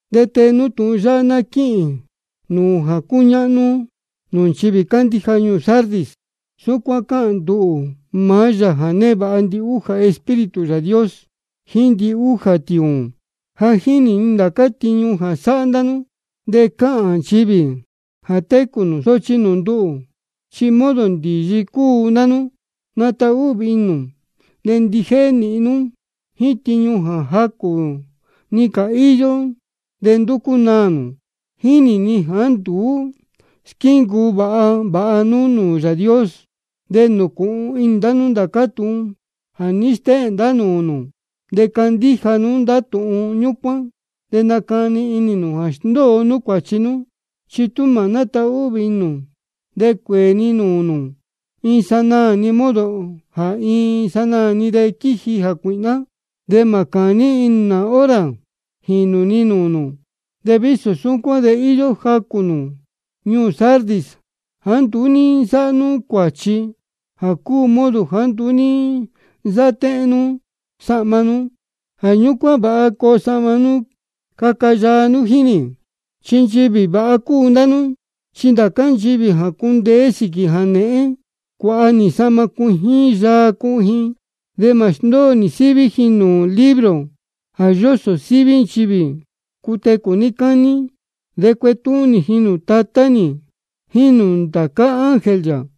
De tee nú tūhun yáhá ná quíhīn nūū jā cúñáhnú nūū nchivī cándíja ñuū Sardis: Súcuán cáhān nduhū, maá Yāā jā névāha ndihújā Espíritu Yāā Dios jíín ndihújā tiūūn. Ja jínī ni ndācá tiñu jā sáhá ndá nú, de cáhān nchivī jā técū nū, sochi nūū nduhū chi modo ndīyi cúu ndá nú. Natahvī inī nū, de ndijéhé nīhin nú jíín tiñu jā jacū-ni cā íyó de ndúcú naā. Chi ja jínī ni jāá nduú squíncuu vāha vāha nú nūū Yāā Dios. De nūcūhun inī nū ndācá tūhun jā ní stéhēn ndá nūū nū. De candíja nú ndá tūhun ñúcuán de nacani inī nū jā sndóo nú cuāchi nú. Chi tú mā nátahvī inī nū, de cuēē ni nūū nū iin sanaā-ni, modo jā iin sanaā-ni de quíji jācuīhná, de mā cūní nú nā hora jīnū ni nūū nū. De vísō súcuán de íyó jacū nū ñuū Sardis jāá nduú ní nsáhá nú cuāchi, jā cúu modo jāá nduú ní nsáhá téhén nú sahma nú. Jā ñúcuán vāha yaa coo sahma nú caca nú jíín nī, chi nchivī vāha cúu ndá nú. Chi ndācá nchivī jā cundeé sīquī jānēhén, cuāha nī sahma cuijín yaa cuhun ji. De mā sndóo nī síví ji nūū libro jā yósō síví nchivī cutecū níí cání. De cuetúhún nī ji nūū Tatá nī jíín nūū ndācá ángel yā.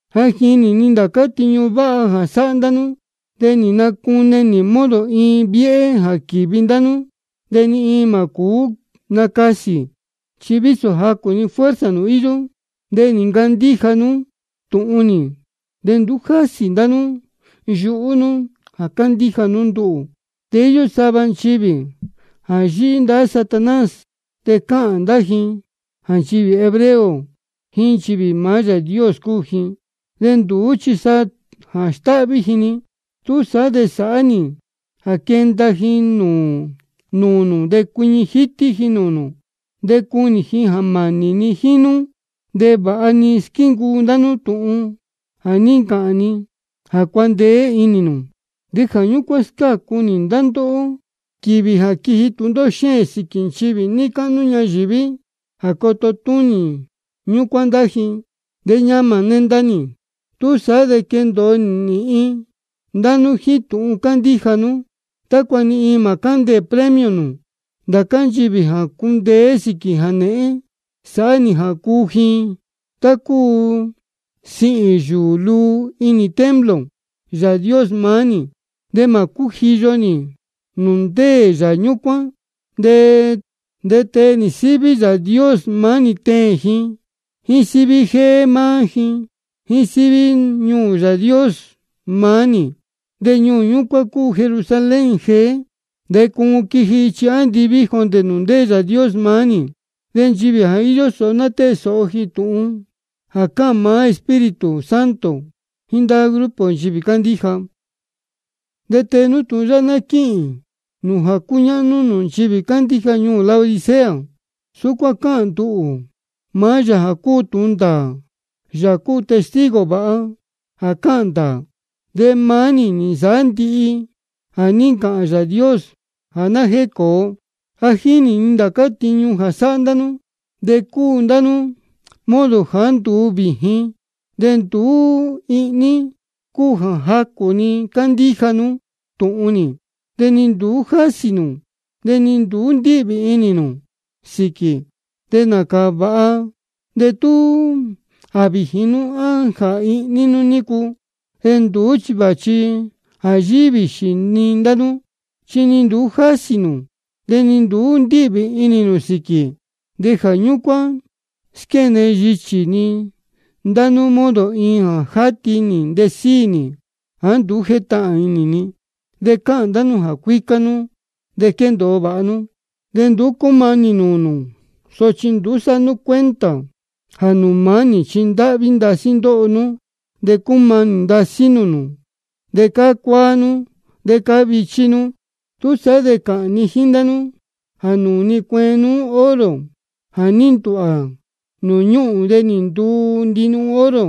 Ja jínī ni ndācá tiñu váha jā sáhá ndá nú. De nī nacune nī modo iin viéhé jā quīvi ndá nú, de ni iin mā cūú nacasī. Chi vísō jacū-ni fuerza nū íyó, de nī ncandíja nú tūhun nī, de nduú jásī ndá nú yuhú nú jā cándíja nú nduhū. De íyó sava nchivī jā yíhí ndahá Satanás, de cáhān ndá ji jā nchivī hebreo jíín nchivī maá Yāā Dios cúu ji, de nduú chi jā stáhví ji-ni. Túsaá de sāhá nī jā quenda ji nūū nū de cuiñi jítí ji nūū nū, de cunī ji jā mānī ni jíín nú. De vāha nī squíncuu ndá nú tūhun jā ní ncāhān ni jā cuandeé inī nū. De jā ñúcuán scácu nī ndá ndóhó quīvī jā quiji iin tūndóhó xéēn sīquī nchivī níí cáhnú ñayīví, jā coto túnī ñúcuán ndá ji. De ñamā nenda nī. Túsaá de quendōo nīhin ndá nú jíín tūhun cándíja nú, tácua ni iin mā cándeē premio nū. Ndācá nchivī jā cundeé sīquī jānēhén, sāhá nī jā cuu ji tá cúu sihīn yūū luu inī templo Yāā Dios maá nī. De mā cújiyo ji nūū ndéē yā ñúcuán. De tee nī síví Yāā Dios maá nī teēn ji, jíín síví jéé maá nī, jíín síví ñuū Yāā Dios maá nī. De ñuū ñúcuán cúu Jerusalén jeé, de cuun quiji ichi andiví jondē nūū Yāā Dios maá nī. Nchivī jā íyó sōho ná tée sōho ji tūhun jā cáhān maá Espíritu Santo jíín ndá grupo nchivī cándíja. De tee nú tūhun yáhá ná quíhīn nūū jā cúñáhnú nūū nchivī cándíja ñuū Laodicea: Súcuán cáhān nduhū, maá Yāā cúu tūhun ndāā, Yāā cúu testigo vāha jā cáhān ndāā. De maá nī nī nsāhá ndihi jā ní ncāhān Yāā Dios jā ná jécōo. Ja jínī ni ndācá tiñu jā sáhá ndá nú. De cúu ndá nú modo jāá nduú vījin de ni nduú ihní, cúu jā jacū-ni cándíja nú tūhun nī, chi ni nduú jásī nū de ni nduú ndíhvī inī nū sīquī. De nācā vāha de tú jā vījin nú á jā ihní nú nícu. De nduú chi vāchi jā yíhí vīxī-ni ndá nú, chi ni nduú jásī nū de ni nduú ndíhvī inī nū sīquī. De jā ñúcuán squéne yichī ni ndá nú modo iin jā játi nī ntesíi nī jāá nduú jétahān inī ni. De cáhān ndá nú jā cuícá nú, de quéndōo vāha nú, de nduú cúmanī ni iin nūū nū. Sochi nduú sáhá nú cuenta jā nūū maá nī chi ndáhví ndasí ndóho nú, de cúmanī ndasí nūū nū, de cácuáá nú, de cávichí nú. Túsaá de cáhān ni jíín ndá nú jā nūū ni cueen nú oro jā ní ndūhvā nūū ñúhūn de nī nduu ndinuhun oro,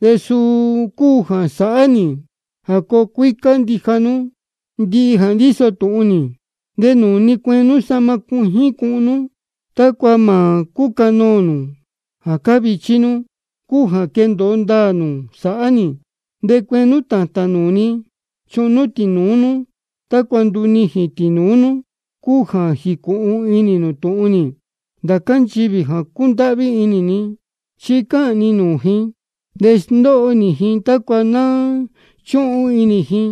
de suu cúu jā sāhá nī jā coo cuícá ndija nú ndihi jā ndíso tūhun nī. De nūū ni cueen nú sahma cuijín cuhun nú, tácua mā cúcanoō nū jā cávichí nú, cúu jā quendōo ndāā nū sāhá nī. De cueen nú tātān nūū ni cuhun tīnūú nú, tácua ndunijīn tīnūú nú, cúu jā jīcūhun inī nū tūhun nī. Ndācá nchivī jā cúndáhví inī ni, chi cáhān ni nūū ji de sndóho nī ji, tácua ná chúhun inī ji.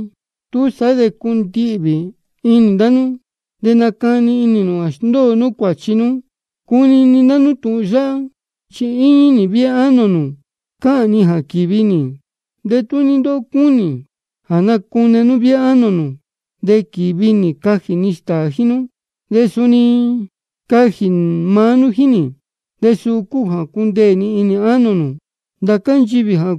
Túsaá de cundihvī inī ndá nú, de nacani inī nū jā sndóo nú cuāchi nú. Cunini ndá nú tūhun yáhá, chi íñí nī viéhé ánō nū cáhān ni jā quīvi nī. De tú ní-ni ndóhó cunini de nacune nú viéhé ánō nū, de quīvi nī cajī ni stāā jíín nú, de suni cajī maá nú jíín nī. De suu cúu jā cundeē ni ánō nū. Ndācá nchivī jā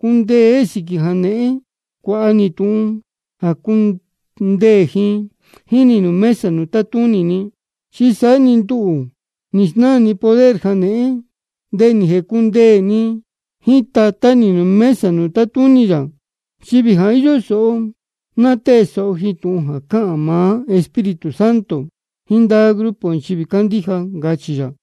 cundeé sīquī jānēhén, cuāha nī tūhun jā cundeē ji jíín nī nūū mesa nūū tátúnī ni. Chi saá-ni nduhū nī snáā ni poder jānēhén, de nī jēcundeē ni jíín Tatá nī nūū mesa nūū tátúnī yā. Nchivī jā íyó sōho ná tée sōho ji tūhun jā cáhān maá Espíritu Santo jíín ndá grupo nchivī cándíja, ncachī yā.